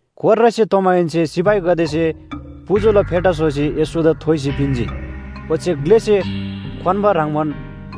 कोर्रासे तोमाहेन्‍से सिपाहीगदेसे पुजुला फेटा स्‍होसी येशूदा थोइसी पिन्‍जी, ओच्‍छे ग्‍लेसे क्‍वान्‍बा ह्रङ्‌बान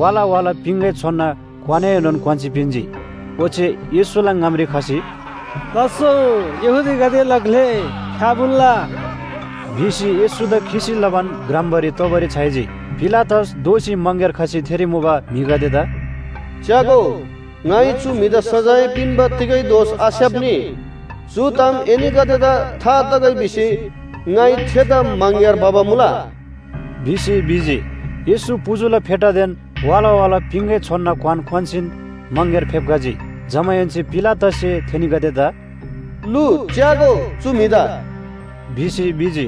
वाला वाला पिङगै छोनना क्‍वानएनोन क्‍वान्‍सी पिन्‍जी। ओच्‍छे येशूला ङामरी खसी, “लास्‍सो यहूदीगदेला ग्‍ले, फ्‍याफुल्‍ला” भिसी येशूदा खिसी लबान ग्रम्‍बारी तोबारी छ्‌याइजी। पिलातस दोःसी मङग्‍यार खसी थेरी मुबा म्‍हिगदेदा “च्‍यागो, ङाइ चु म्‍हिदा सजाय पिन्‍बा तिगै दोष आस्‍याप्‍नी। चु ताम एनीगदेदा था तगै भिसी ङाइ थेदा मङग्‍यार भबा मुला” भिसी भिजी। येशू पुजुला फेटादेन वाला वाला पिङगै छोनना क्‍वान क्‍वान्‍सीन मङग्‍यार फेप्‍खजी। जमाहेन्‍से पिलातससे थेनीगदेदा “लु, च्‍यागो, चु म्‍हिदा!” भिसी भिजी।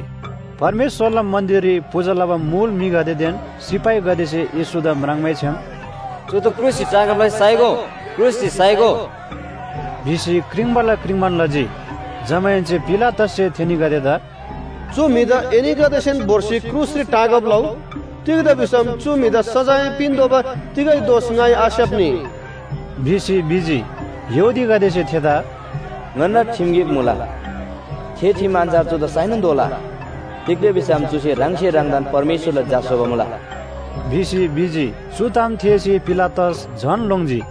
परमेश्‍वरला मन्‍दिररी पूजा लबा मुल म्‍हिगदेदेन सिपाहीगदेसे येशूदा म्राङ्मैछ्‍याम “चुदा क्रुसरी टाँगब लसी साइगो, क्रुसरी साइगो!” भिसी क्रिङ्बाला क्रिङ्बान लजी। जमाहेन्‍से पिलातससे थेनीगदेदा “चु म्‍हिदा एनीगदेसेन भोर्सी क्रुसरी टाँगब लउ, तिग्‍दा भिसम चु म्‍हिदा सजाय पिन्‍तोःबा तिगै दोष ङाइ आस्‍याप्‍नी” भिसी भिजी। यहूदीगदेसे थेदा “ङन्‍ना ठिम गिक मुला थे ठिम अन्‍छार चुदा साइनोन तोःला। तिग्‍दा भिसम चुसे ह्राङसे ह्राङदान परमेश्‍वरला झा स्‍होबा मुला” भिसी भिजी। चु ताम थेःसी पिलातस झन लोङ्जी।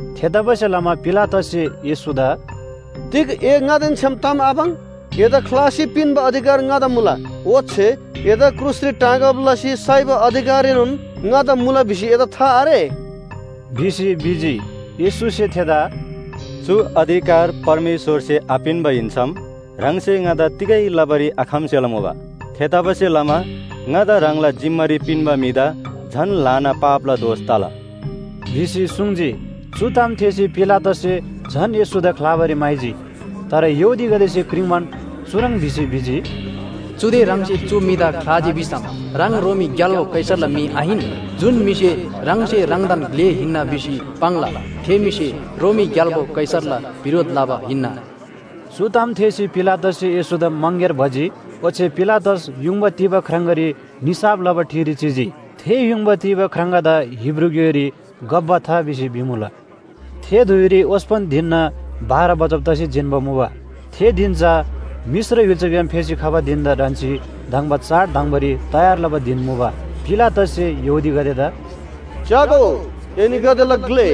थेतबासेलमा पिलातससे येशूदा “तिग ए ङादेन छ्‌याम ताम आपाङ्? एदा ख्‍लासी पिन्‍बा अधिकार ङादा मुला, ओच्‍छे एदा क्रुसरी टाँगब लसी साइबा अधिकारएनोन ङादा मुला भिसी एदा था आरे?” भिसी भिजी। येशूसे थेदा “चु अधिकार परमेश्‍वरसे आपिन्‍बा हिन्‍सम ह्राङसे ङादा तिगै लबारी आखम्‍बसेला मुबा। थेतबासेलमा ङादा ह्राङला जिम्‍मारी पिन्‍बा म्‍हिदा झन ल्‍हाना पापला दोष तला” भिसी सुङ्जी। चु ताम थेःसी पिलातससे झन येशूदा ख्‍लाबारी म्‍हाइजी। तर यहूदीगदेसे क्रिङ्बान चुह्रङ् भिसी भिजी, “चुदे ह्राङसे चु म्‍हिदा ख्‍लाजी भिसम ह्राङ रोमी ग्‍याल्‍बो कैसरला म्‍हि आहिन। जुन म्‍हिसे ह्राङसे ह्राङदान ग्‍ले हिन्‍ना भिसी पाङ्ला थे म्‍हिसे रोमी ग्‍याल्‍बो कैसरला बिरोध लबा हिन्‍ना।” चु ताम थेःसी पिलातससे येशूदा मङग्‍यार भजी ओच्‍छे पिलातस युङबा तीबा ख्राङगारी निसाफ लबा ठिरी चिजी। थे युङबा तीबा ख्राङगादा हिब्रू ग्‍योइरी गब्‍बथा भिसी भिमुला। थे धुइरी ओस्‍पन धिनना बाह्र बजब तसी जिन्‍बा मुबा। थे धिन चा मिश्र य्‍हुल्‍साग्‍याम फेसी खबा धिन‍दा ढन्‍सी धङ्बा चाड धङ्‍बारी तयार लबा धिन मुबा। पिलातससे यहूदीगदेदा “च्‍यागो, एनीगदेला ग्‍ले”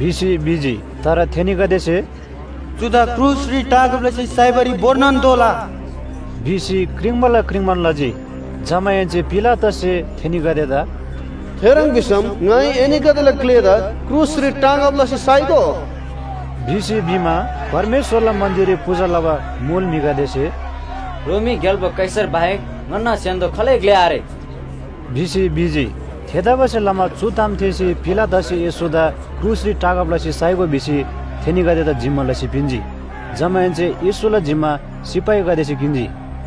भिसी भिजी। तर थेनीगदेसे “चुदा क्रुसरी टाँगब लसी साइबारी भोर्नोन तोःला” भिसी क्रिङ्बाला क्रिङ्बान लजी। जमाहेन्‍से पिलातससे थेनीगदेदा “थेह्रङ् भिसम ङाइ एनीगदेला ग्‍लेदा क्रुसरी टाँगब लसी साइगो?” भिसी भिमा, परमेश्‍वरला मन्‍दिररी पूजा लबा मुल म्‍हिगदेसे “रोमी ग्‍याल्‍बो कैसर बाहेक ङन्‍ना स्‍य्‍हान्‍दो खालै ग्‍ले आरे” भिसी भिजी। थेतबासेलमा चु ताम थेःसी पिलातससे येशूदा क्रुसरी टाँगब लसी साइगो भिसी थेनीगदेदा जिम्‍मा लसी पिन्‍जी। जमाहेन्‍से येशूला जिम्‍मा सिपाहीगदेसे किन्‍जी।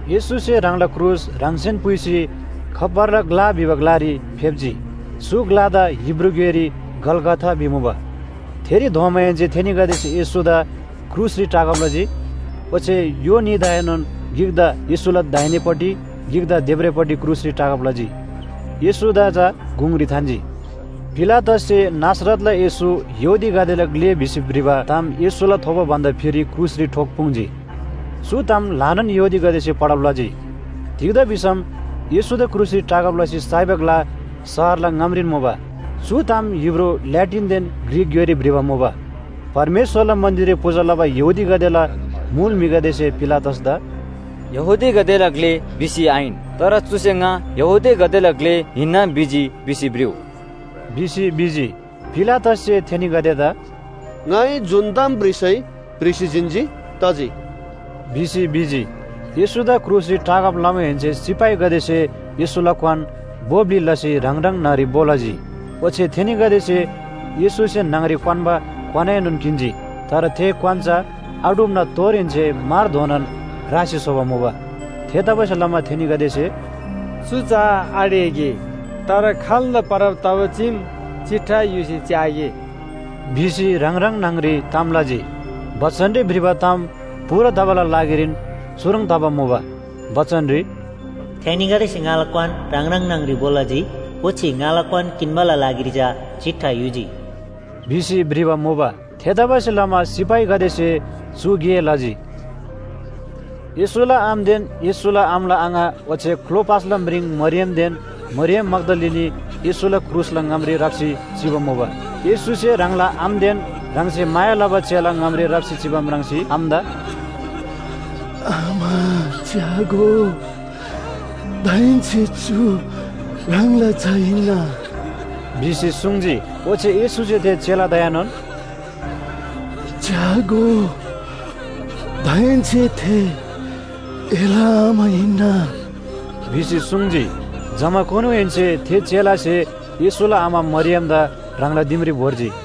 येशूसे ह्राङला क्रुस ह्राङसेन पुइसी, “खप्‍परला ग्‍ला” भिबा ग्‍लारी फेप्‍जी, चु ग्‍लादा हिब्रू ग्‍योइरी गलगथा भिमुबा। थेरी धोमाहेन्‍से थेनीगदेसे येशूदा क्रुसरी टाँगब लजी, ओच्‍छे य्‍हो न्‍हीदाएनोन गिकदा येशूला दाहिनेपट्टि गिकदा देब्रेपट्टि क्रुसरी टाँगब लजी। येशूदा चा गुङरी थान्‍जी। पिलातससे “नासरतला येशू, यहूदीगदेला ग्‍ले” भिसी भ्रिबा ताम येशूला थोबो भन्‍दा फिरी क्रुसरी ठोक्‍पुङ्जी। चु ताम ल्‍हानान यहूदीगदेसे पढब लजी। तिग्‍दा भिसम येशूदा क्रुसरी टाँगब लसी साइबा ग्‍ला शहरला ङामरीन मुबा। चु ताम हिब्रू, ल्‍याटिनदेन ग्रीक ग्‍योइरी भ्रिबा मुबा। परमेश्‍वरला मन्‍दिररी पूजा लबा यहूदीगदेला मुल म्‍हिगदेसे पिलातसदा “‘यहूदीगदेला ग्‍ले’ भिसी आहिन, तर चुसे ङा यहूदीगदेला ग्‍ले हिन्‍ना भिजी भिसी भ्रिउ” भिसी भिजी। पिलातससे थेनीगदेदा “ङाइ जुन ताम भ्रिसै, भ्रिसी जिन्‍जी, तजी” भिसी भिजी। येशूदा क्रुसरी टाँगब लमाहेन्‍से सिपाहीगदेसे येशूला क्‍वान भो ब्‍लि लसी ह्राङ ह्राङ न्‍हङ‍री भो लजी। ओच्‍छे थेनीगदेसे येशूसे न्‍हङ‍री क्‍वान्‍बा क्‍वानएनोन किन्‍जी, तर थे क्‍वान चा आढुप्‍ना तोरहेन्‍से मारधोनान रासी स्‍होबा मुबा। थेतबासेलमा थेनीगदेसे “चु चा आढेगे, तर खाल्‍दा परब तबा चीम चिट्ठा युसी च्‍यागे” भिसी ह्राङ ह्राङ न्‍हङ‍री ताम लजी। बचनरी भ्रिबा ताम पूरा तबाला लागिरीन चुह्रङ् तबा मुबा। बचनरी “थेनीगदेसे ङाला क्‍वान ह्राङ ह्राङ न्‍हङ‍री भो लजी, ओच्‍छे ङाला क्‍वान किन्‍बाला लागिरी चा चिट्ठा युजी” भिसी भ्रिबा मुबा। थेतबासेलमा सिपाहीगदेसे चु गे लजी। येशूला आमादेन येशूला आमाला आङा ओच्‍छे क्‍लोपासला म्रिङ मरियमदेन मरियम मग्‍दलिनी येशूला क्रुसला ङामरी राप्‍सी चिबा मुबा। येशूसे ह्राङला आमादेन ह्राङसे माया लबा चेला ङामरी राप्‍सी चिबा म्राङ्सी आमादा “आमा च्‍यागो, दाहेन्‍से चु ह्राङला झा हिन्‍ना” भिसी सुङ्जी। ओच्‍छे येशूसे थे चेलादाएनोन “च्‍यागो, दाहेन्‍से थे एला आमा हिन्‍ना” भिसी सुङ्जी। जमाकुनुहेन्‍से थे चेलासे येशूला आमा मरियमदा ह्राङला दिमरी भोर्जी।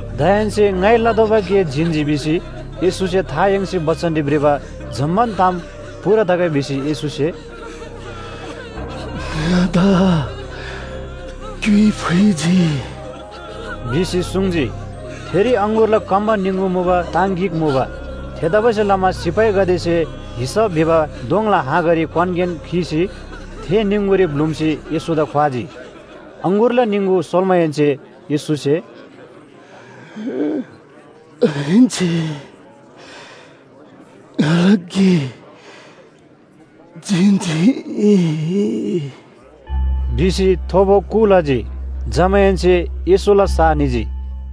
“दाहेन्‍से ङाइ लतोःबा गे जिन्‍जी” भिसी येशूसे था याङ्सी बचनरी भ्रिबा जम्‍मान ताम पूरा तगै भिसी येशूसे “ङादा क्‍युइ फुइजी” भिसी सुङ्जी। थेरी अङगुरला कम्‍बा निङगु मुबा ताङ गिक मुबा। थेतबासेलमा सिपाहीगदेसे हिसप भिबा दोङला हाँगारी क्‍वानगेन खीसी थे निङगुरी ब्‍लुम्‍सी येशूदा ख्‍वाजी। अङगुरला निङगु सोल्‍माहेन्‍से येशूसे “दाहेन्‍से ङाला गे जिन्‍जी” भिसी थोबो कु लजी। जमाहेन्‍से येशूला सा निजी।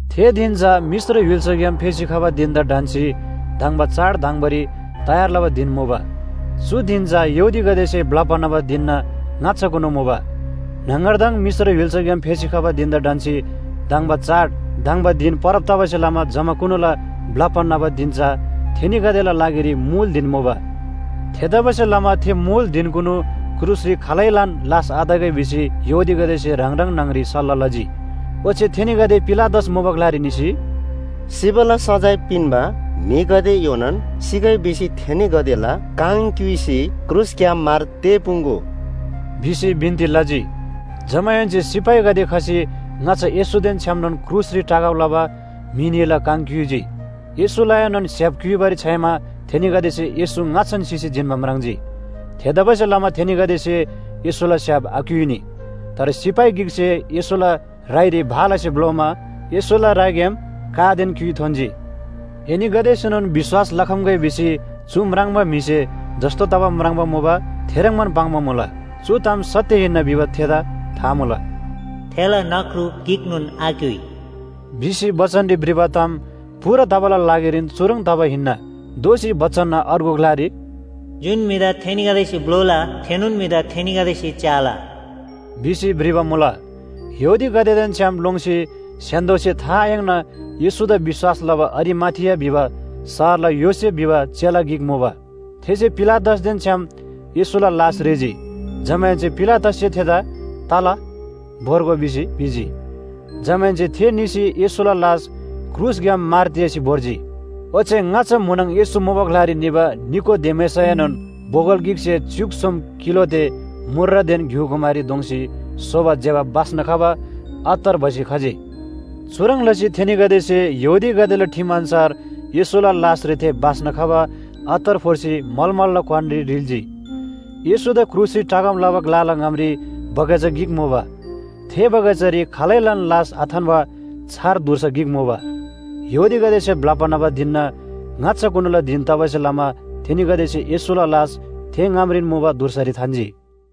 थे धिन चा मिश्र य्‍हुल्‍साग्‍याम फेसी खबा धिन‍दा ढन्‍सी धङ्बा चाड धङ्‍बारी तयार लबा धिन मुबा। चु धिन चा यहूदीगदेसे ब्‍लप्‍बा न्‍हबा धिनना ङाच्‍छाकुनु मुबा। न्‍हङगरदङ मिश्र य्‍हुल्‍साग्‍याम फेसी खबा धिन‍दा ढन्‍सी धङ्बा चाड धङ्बा धिन परब तबासे लमा जमाकुनुला ब्‍लप्‍बा न्‍हबा धिन चा थेनीगदेला लागिरी मुल धिन मुबा। थेतबासेलमा थे मुल धिनकुनु क्रुसरी खालैलान लास आतगै भिसी यहूदीगदेसे ह्राङ ह्राङ न्‍हङ‍री सल्‍लाह लजी। ओच्‍छे थेनीगदे पिलातस मुबा ग्‍लारी निसी, “सिबाला सजाय पिन्‍बा म्‍हिगदे योनान सिगै भिसी थेनीगदेला काङ क्‍युइसी क्रुसग्‍याम मार तेःपुङ्‍गो” भिसी बिन्‍ती लजी। जमाहेन्‍से सिपाहीगदे खसी ङाच्‍छा येशूदेन छ्‌यामनोन क्रुसरी टाँगब लबा म्‍हि न्‍हीला काङ क्‍युइजी। येशूलाएनोन स्‍य्‍हाप क्‍युइबारी छ्‌याइमा थेनीगदेसे येशू ङाच्‍छान सिसी जिन्‍बा म्राङ्जी। थेतबासेलमा थेनीगदेसे येशूला स्‍य्‍हाप आक्‍युइनी। तर सिपाही गिकसे येशूला राइरी भालासे भ्‍लोमा येशूला राइग्‍याम कादेन क्‍युइ थोन्‍जी। एनीगदेसेनोन विश्‍वास लखम्‍गै भिसी चु म्राङ्बा म्‍हिसे जस्‍तो तबा म्राङ्बा मुबा थेह्रङ्बान पाङ्बा मुला। चु ताम सत्‍य हिन्‍ना भिबा थेदा था मुला। “थेला नख्रु गिकनोन आक्‍युइ” भिसी बचनरी भ्रिबा ताम पूरा तबाला लागिरीन चुह्रङ् तबा हिन्‍ना। दोःसी बचनना अर्गु ग्‍लारी “जुन म्‍हिदा थेनीगदेसे भ्‍लोला, थेनोन म्‍हिदा थेनीगदेसे च्‍याला” भिसी भ्रिबा मुला। यहूदीगदेदेन छ्‌याम लोङ्सी स्‍य्‍हान्‍दोसे था आयाङ्ना येशूदा विश्‍वास लबा अरिमाथिया भिबा शहरला योसेफ भिबा चेला गिक मुबा। थेसे पिलातसदेन छ्‌याम येशूला लास ह्रीजी, जमाहेन्‍से पिलातससे थेदा “तला, भोर्गो” भिसी भिजी। जमाहेन्‍से थे निसी येशूला लास क्रुसग्‍याम मार तेःसी भोर्जी। ओच्‍छे ङाच्‍छा म्‍हुनङ येशू मुबा ग्‍लारी निबा निकोदेमसएनोन बोगल गिकसे च्‍युक सोम किलो ते मूर्रदेन घ्‍युकुमारी दोङ्‌सी स्‍होबा ज्‍यबा बास्‍ना खबा अत्तर भसी खजी। चुह्रङ् लसी थेनीगदेसे यहूदीगदेला ठिम अन्‍छार येशूला लासरी थे बास्‍ना खबा अत्तर फोर्सी मलमलला क्‍वानरी रिल्‍जी। येशूदा क्रुसरी टाँगब लबा ग्‍लाला ङामरी बगैँचा गिक मुबा। थे बगैँचारी खालैलान लास आथान्‍बा छार धुर्सा गिक मुबा। यहूदीगदेसे ब्‍लप्‍बा न्‍हबा धिनना ङाच्‍छाकुनुला धिन तबासे लमा थेनीगदेसे येशूला लास थे ङामरीन मुबा धुर्सारी थान्‍जी।